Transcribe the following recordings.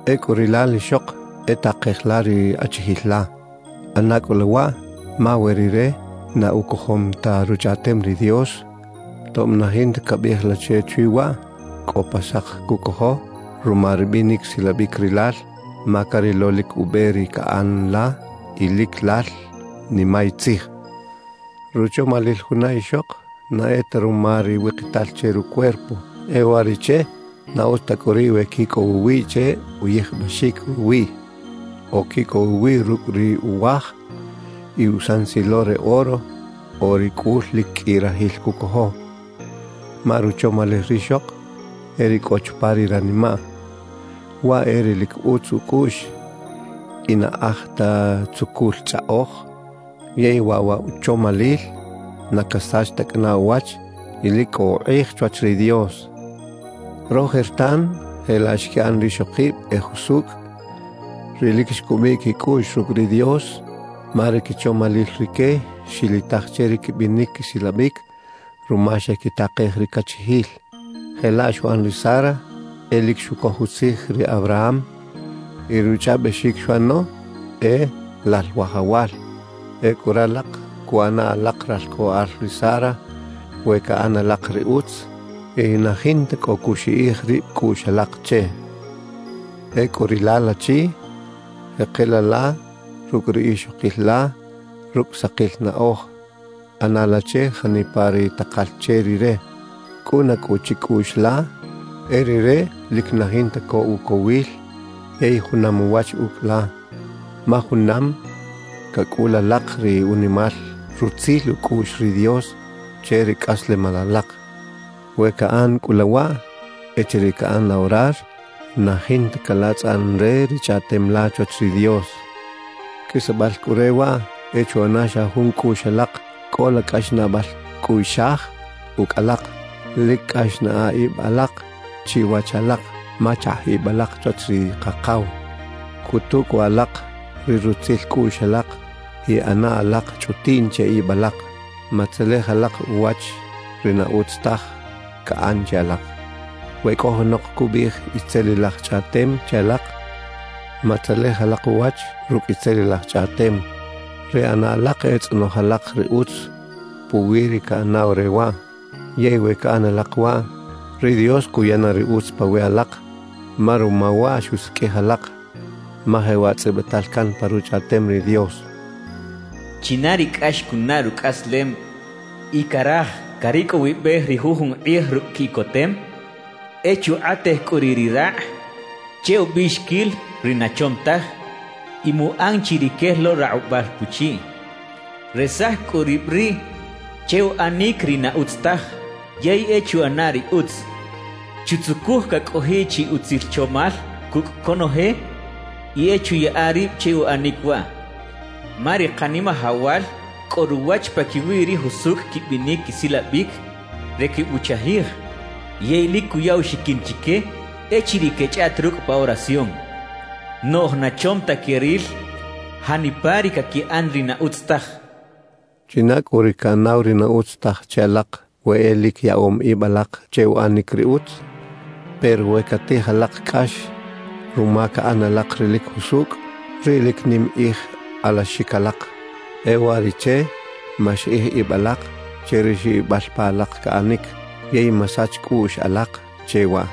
Ecꞌu rilal ixok, e takej la ri achijil la. ꞌAna cꞌu la waꞌ ma we rire na ucojom ta Ruchꞌaꞌtem ri Dios, tob na jinta cabiꞌij la che chwi waꞌ, cꞌo pa sak cucojo ruma ri binic silabic rilal ma carilo lic ube ri caꞌan la y lic lal nimay tzij. Ruchomalil juna ixok na e ta ruma ri wikital che rucuerpo; e uwariꞌche na utz ta cꞌu riꞌ we quicꞌow uwiꞌ che uyijbaxic ruwiꞌ, o quicꞌow uwiꞌ rucꞌ ri uwaaj y usansilo re oro o ri cꞌul lic qꞌui rajil cucojo. Ma ruchomalil rixok e ri cꞌo chupa ri ranimaꞌ; waꞌ e ri lic utz ucꞌuꞌx y na aj ta tzucul chꞌaꞌoj. Yey waꞌ wa uchomalil na casach ta cꞌana uwach y lic cꞌo ukꞌij chwach ri Dios. Rojertan jelaꞌ xquiꞌan rixokib e jusucꞌ, ri lic xcubiꞌ quicꞌuꞌx rucꞌ ri Dios. Ma ri quichomalil rique xilitaj che ri quibinic quisilabic ruma xequitakej ri cachijil. Jelaꞌ xuꞌan ri Sara, e lic xucoj utzij ri Abraham y ruchꞌaꞌbexic xuꞌano e “lal wajawal”. Ecꞌu ralak cuꞌana alak ralcꞌoꞌal ri Sara we caꞌan alak ri utz y na jinta cꞌo cuxiꞌij rib cꞌuꞌx alak che. Ecꞌu rilal achi, jekela la rucꞌ ri ixokil la rucꞌ sakil naꞌoj. ꞌAna la che janipa ri takal che rire. Cꞌuna cꞌu chicꞌuꞌx la e rire lic na jinta co ucowil yey junam uwach ucꞌ la, ma junam cacꞌul alak ri unimal rutzil ucꞌuꞌx ri Dios che ri cꞌaslemal alak. We caꞌan cꞌu la waꞌ, echiriꞌ caꞌan la orar, na jinta calatzꞌan re ri chꞌaꞌtem la chwach ri Dios. Qꞌuisbal cꞌu re waꞌ, e chuꞌana xa jun cꞌuꞌx alak, cꞌola cꞌaxnaꞌbal cꞌuꞌxaj ucꞌ alak, lic cꞌax naꞌa ib alak chiwach alak ma chakꞌ ib alak chwach ri Kakaw, cꞌutu cꞌu alak ri rutzil cꞌuꞌx alak y ꞌana alak chꞌutiꞌn che ib alak. Matzelej alak uwach ri na utz taj caꞌan che alak. We cꞌo junok cubiꞌij itzelilaj chꞌaꞌtem che alak, matzelej alak uwach rucꞌ itzelilaj chꞌaꞌtem; ri ꞌana alak e tzꞌonoj alak ri utz puwi ri caꞌanaw re waꞌ. Yey we caꞌan alak waꞌ, ri Dios cuya na ri utz pawiꞌ alak, ma ruma waꞌ xusiqꞌuij alak. Ma jewaꞌ tzꞌibital can pa Ruchꞌaꞌtem ri Dios: China ri cꞌax cunaꞌ rucꞌaslem y caraj caricꞌowibej ri jujun kꞌij rucꞌ quiꞌcotem, e chukꞌatej cꞌu riꞌ ri rakꞌ che ubiꞌxiquil ri na chom taj y muꞌan chi ri quel lo rakꞌubal puchiꞌ. Resaj cꞌu rib riꞌ che uꞌanic ri na utz taj, yey e chuꞌana ri utz. Chutzucuj cacꞌojiꞌ chi utzil chomal cucꞌ conoje y e chuyaꞌa rib che uꞌanic waꞌ. Ma ri Kanimajawal cꞌo ruwach paquiwi ri jusucꞌ quibinic quisilabic re quebuchajij, yey lic cuya uxiquin chique echiriꞌ quechꞌaꞌt rucꞌ pa oración. Noꞌj na chom ta queril janipa ri caquiꞌan ri na utz taj cachaꞌ. ¿China cꞌu ri caꞌanaw ri na utz taj che alak we e lic yaꞌom ib alak che uꞌanic ri utz? Pero we catij alak cꞌax ruma caꞌan alak ri lic jusucꞌ, riꞌ lic nim kꞌij alaxic alak. E uwariꞌche, maxiꞌij ib alak che ri xibibal pa alak caꞌanic yey masach cꞌuꞌx alak che waꞌ.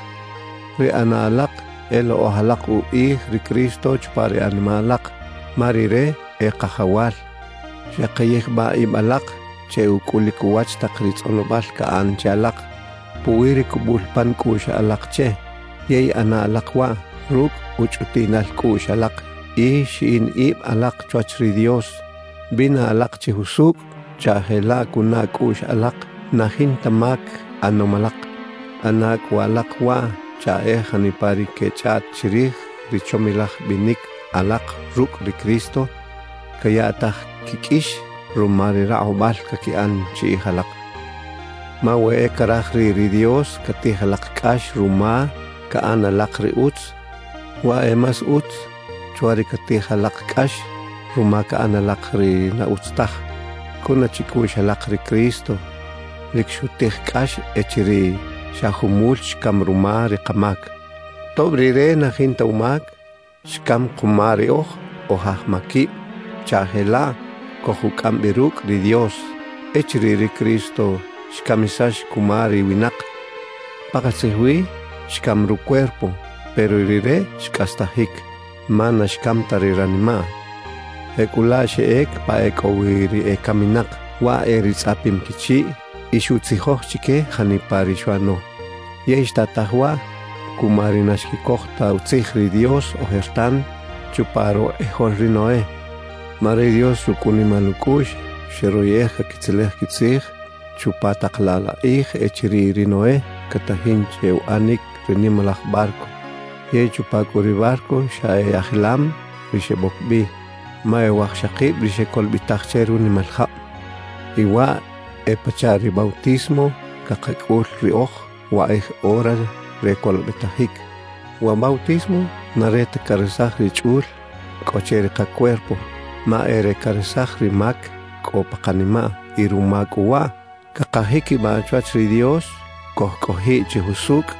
Ri ꞌana alak e lokꞌoj alak ukꞌij ri Cristo chupa ri animaꞌ alak, ma Rire e Kajawal. Xaki yijbaꞌ ib alak che ucꞌulic uwach tak ri tzꞌonobal caꞌan che alak puwi ri cubul pan cꞌuꞌx alak che; yey ꞌana alak waꞌ rucꞌ uchꞌutiꞌnal cꞌuꞌx alak y xiꞌin ib alak chwach ri Dios. Bina alak chi jusucꞌ chaꞌ jelaꞌ cunaꞌ cꞌuꞌx alak na jinta mac ꞌanom alak. ꞌAna cꞌu alak waꞌ chaꞌ e janipa ri quechꞌaꞌt chirij ri chomilaj binic alak rucꞌ ri Cristo, cayaꞌtaj quiqꞌuix ruma ri rakꞌubal caquiꞌan chiꞌij alak. Ma we e caraj riꞌ ri Dios catij alak cꞌax ruma caꞌan alak ri utz, waꞌ e más utz chwa ri catij alak cꞌax ruma caꞌan alak ri na utz taj. Cꞌuna chicꞌuꞌx alak, ri Cristo lic xutij cꞌax echiriꞌ xa jumul xcam ruma ri kamac. Tob Rire na jinta umac, xcam kuma riꞌoj oj aj maquib chaꞌ jelaꞌ cojucꞌam bi rucꞌ ri Dios. Echiriꞌ ri Cristo xcamisax cuma ri winak, pakatzij wi xcam rucuerpo; pero Rire xcꞌastajic, ma na xcam ta ri ranimaꞌ. Jecꞌulaꞌ xeꞌec pa ecꞌowi ri ecaminak, waꞌ e ri tzꞌapim quichiꞌ, y xuꞌtzijoj chique janipa ri xuꞌano. Yey xtataj waꞌ cuma ri na xquicoj ta utzij ri Dios ojertan chupa rukꞌijol ri Noé. Ma ri Dios rucꞌ unimal ucꞌuꞌx xeroyꞌej caquitzelej quitzij chupa tak laꞌ la kꞌij echiriꞌ ri Noé catajin che uꞌanic ri nimalaj barco. Yey chupa cꞌu ri barco xa e ajilam ri xeboc bi, ma e wajxakib ri xecolobetaj che runimal jab. Y waꞌ e pachaꞌ ri bautismo cakacꞌul riꞌoj wakꞌij ora re colobetajic. Wa bautismo na re ta caresaj ri chꞌul cꞌo che ri kacuerpo, ma e re caresaj ri mac cꞌo pa kanimaꞌ y ruma cꞌu waꞌ cakajiquibaꞌ chwach ri Dios cojcꞌojiꞌ chi jusucꞌ.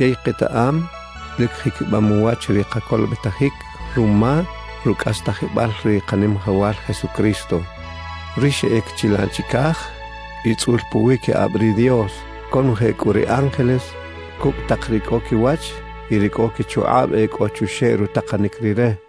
Yey ketaꞌam lic jiquibam uwach ri kacolobetajic ruma rucꞌastajibal ri Kanimajawal Jesucristo, ri xeꞌec chilaꞌ chicaj y tzꞌul puwiquikꞌab ri Dios. Conoje cꞌu ri ángeles, cucꞌ tak ri cꞌo quiwach y ri cꞌo quichukꞌab e cꞌo chuxeꞌ rutakanic Rire.